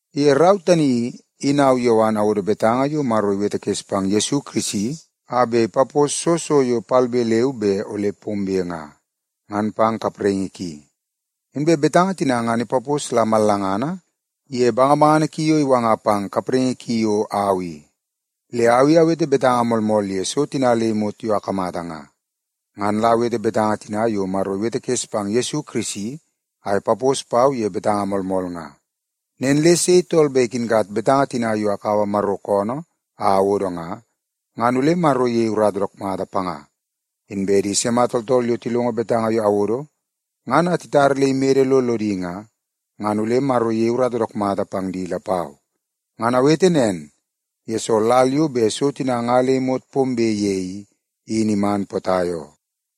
Ye rau tani i, in au Yowan awodo betanga yo Maro iwetekes pang Yesu Kirisi a bet ipapos soo so yo palbe leu be ole pombe nga, ngan pang di kapraingi ki. Inbe betanga tina ngan ipapos la mallangana ye bangabangana ki yo iwanga pang kapraingi ki yo au i. Le au i awete betanga moolmool ye so tina le imot yo akamata nga. Ngan la awete betanga tina yo Maro iwetekes pang Yesu Kirisi a ipapos pau ye betanga moolmool nga. Nen le sei tool bet ikinkat betanga tina yo akaua Maro koonoo a awodo nga, ngan ole Maro iyei urata dook mata panga. Inbe di sima tooltool yo tilongo betanga yo awodo ngan a titar le imede lo lodi nga, ngan ole Maro iyei urata dook mata pang di lapau. Ngan awete nen, yesoo lal yo bet so tina nga le imot pombe ye i, in iman potai oo.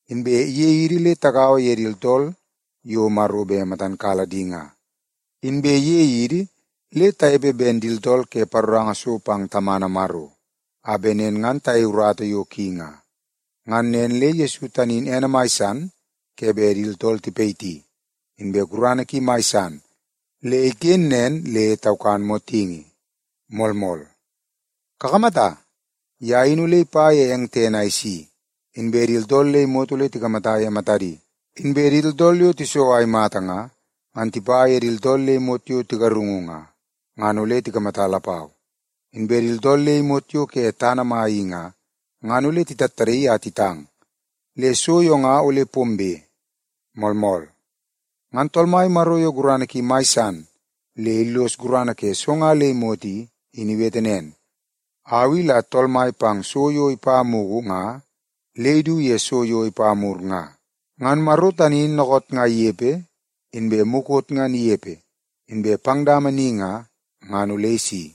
Inbe iyei idi le tagaua ye di tooltool yo Maro bet matan kala di nga, inbe iyei idi le tanepe ben di tooltool ke paroranga so pang Tamana Maro, a bet nen ngan tayei urata yo ki nga. Ngan nen le Yesu tani in ene mai san ke bet di tooltool tipayiti, inbe gurana ki in mai san le iken nen le taukan motingi. Moolmool. Kakamata, ye in ole ipa ye eng tene a isi, inbe di tooltool le imot ole tikamata ye matadi. Inbe di tooltool yo tiso a imata nga, ngan tipa ye di tooltool le imot yo tigarungu nga, ngan ole tikamata lapau. Inbe di tooltool le imot yo ke tana mai i nga, ngan ole titattadaii a titang. Le so yo nga ole pombe. Moolmool. Ngan Tool Mai Maro yo gurana ki mai san le illos gurana ke so nga le imot i, in iwete nen, “Au i la Tool Mai pang so yo ipa mugu nga le idu ye so yo ipa mur nga.” Ngan Maro tani in dookoot nga inepe, inbe mukot ngan inepe, inbe pang dama ni nga, ngan ole isi.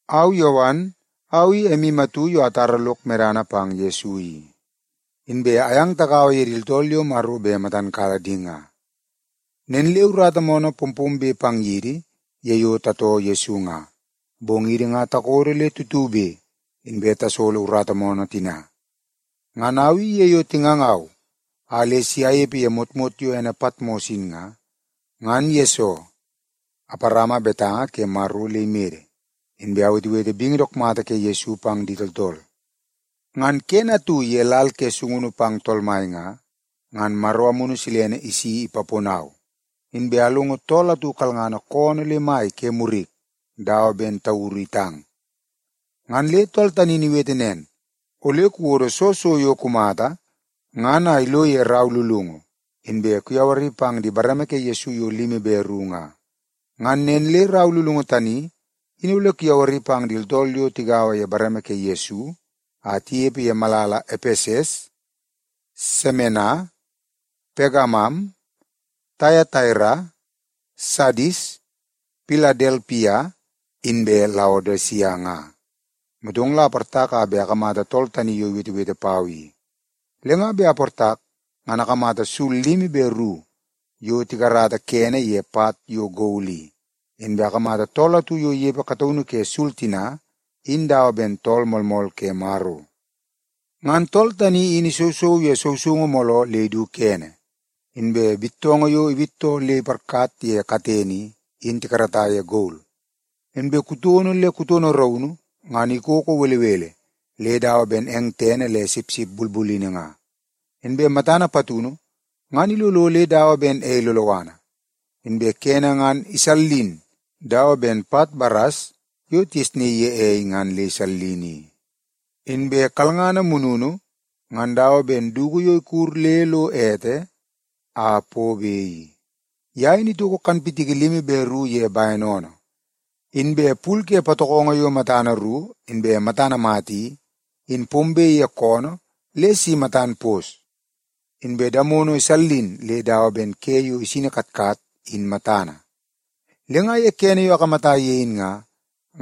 Au Yowan, au i emu atu yo atara lok medana pang Yesu i. Inbe ayang tagaua ye di tooltool yo Maro bet matan kala di nga. Nen le urata moonoo pompombe pang yidi ye yo tatoo Yesu nga, bong idi nga takodo le tutube, inbe tasolo urata moonoo tina. Ngan au i ye yo tingangau a le si anepe ye motmot yo ene Patmos in nga, ngan yesoo aparama betanga ke Maro le imede, inbe awetewete bingi dook mata ke Yesu pang di tooltool. Ngan kene atu ye lal ke sungunu pang Tool Mai nga, ngan Maro Amunu Silene isi ipaponau, inbe alongo tool atu kalngana koonoo le mai ke murik dawa ben tauru itang. Ngan le tool tani in iwete nen, “Ole kuwodo soo so yo kumata ngan a ilo ye rau lulungu, inbe kuyawari pang di bareme ke Yesu yo limi be ru nga. Ngan nen le rau lulungu tani in ole kuyawari pang di tooltool yo tigaua ye bareme ke Yesu a tinepe ye malala Epeses, Semena, Pegamam, Taiataira, Sadis, Piladelpia inbe Laodisia nga.” Motong la aportak a bet akamata tool tani yo iwetewete pau i. Le nga bet aportak, ngan akamata sul limi be ru yo tikarata kene ye pat yo gol i. Inbe akamata tool atu yo inepe kataunu ke sul tina in dawa ben Tool Moolmool ke Maro. Ngan tool tani in isousou ye sousoungu mooloo le idu kene, inbe bittoongoo yo iwittoo le iparkat ye katene i, in tikarata ye gol. Inbe kutono le kutono raunu, ngan ikoko belebele le dawa ben eng tene le sipsip bulbulini nga. Inbe matana patunu, ngan ilolo le dawa ben ei loloana. Inbe kene ngan isallin dawa ben pat baras yo tigesnaii ye ei ngan le isallin i. Inbe kalngana mununu ngan dawa ben dugu yo ikud le lo ete a pobe i. Ye in itoko kanpitiki limi be ru ye bene oonoo. Inbe pul ke patokongo yo matana ru inbe matana mata i, in pombe ye koonoo le si matan pos. Inbe damono isallin le dawa ben ke yo isini katkat in matana. Le nga ye kene yo akamata ye in nga,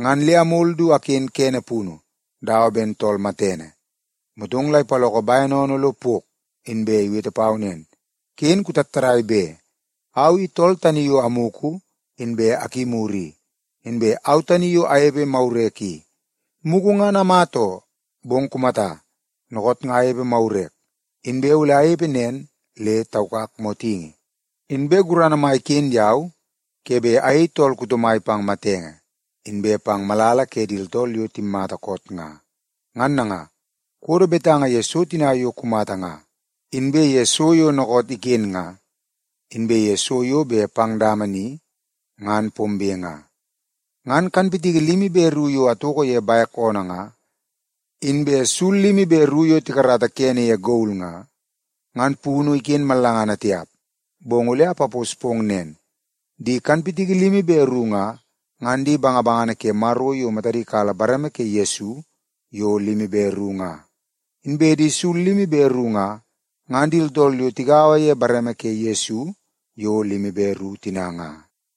ngan le amol du aken kene punu dawa ben tool matene. Motong la ipaloko bene oonoo lo pok, inbe iwete pau nen, “Ken kutattadai be! Au i tool tani yo amugu inbe akimur i, inbe au tani yo anepepe magurek i. Mugu ngan amata oo, bong kumata, dookoot nga anepe magurek, inbe ole anepe nen le taukak motingi. Inbe gurana mai iken yau ke bet ayei tool kuto mai pang matenge, inbe pang malala ke di tooltool yo timmata koot nga. “Ngan nanga, kuwodo betanga ye so tina yo kumata nga, inbe ye so yo dookoot iken nga, inbe ye so yo bet pang dama ni ngan pombe nga. Ngan kanpitiki limi be ru yo atoko ye bek oonoo nga, inbe sul limi be ru yo tikarata kene ye gol nga, ngan punu iken mallangana tiap, bong ole apapos pong nen. Di kanpitiki limi be ru nga, ngan di bangabangana ke Maro yo matadi kala bareme ke Yesu yo limi be ru nga. Inbe di sul limi be ru nga, ngan di tooltool yo tigaua ye bareme ke Yesu yo limi be ru tina nga.”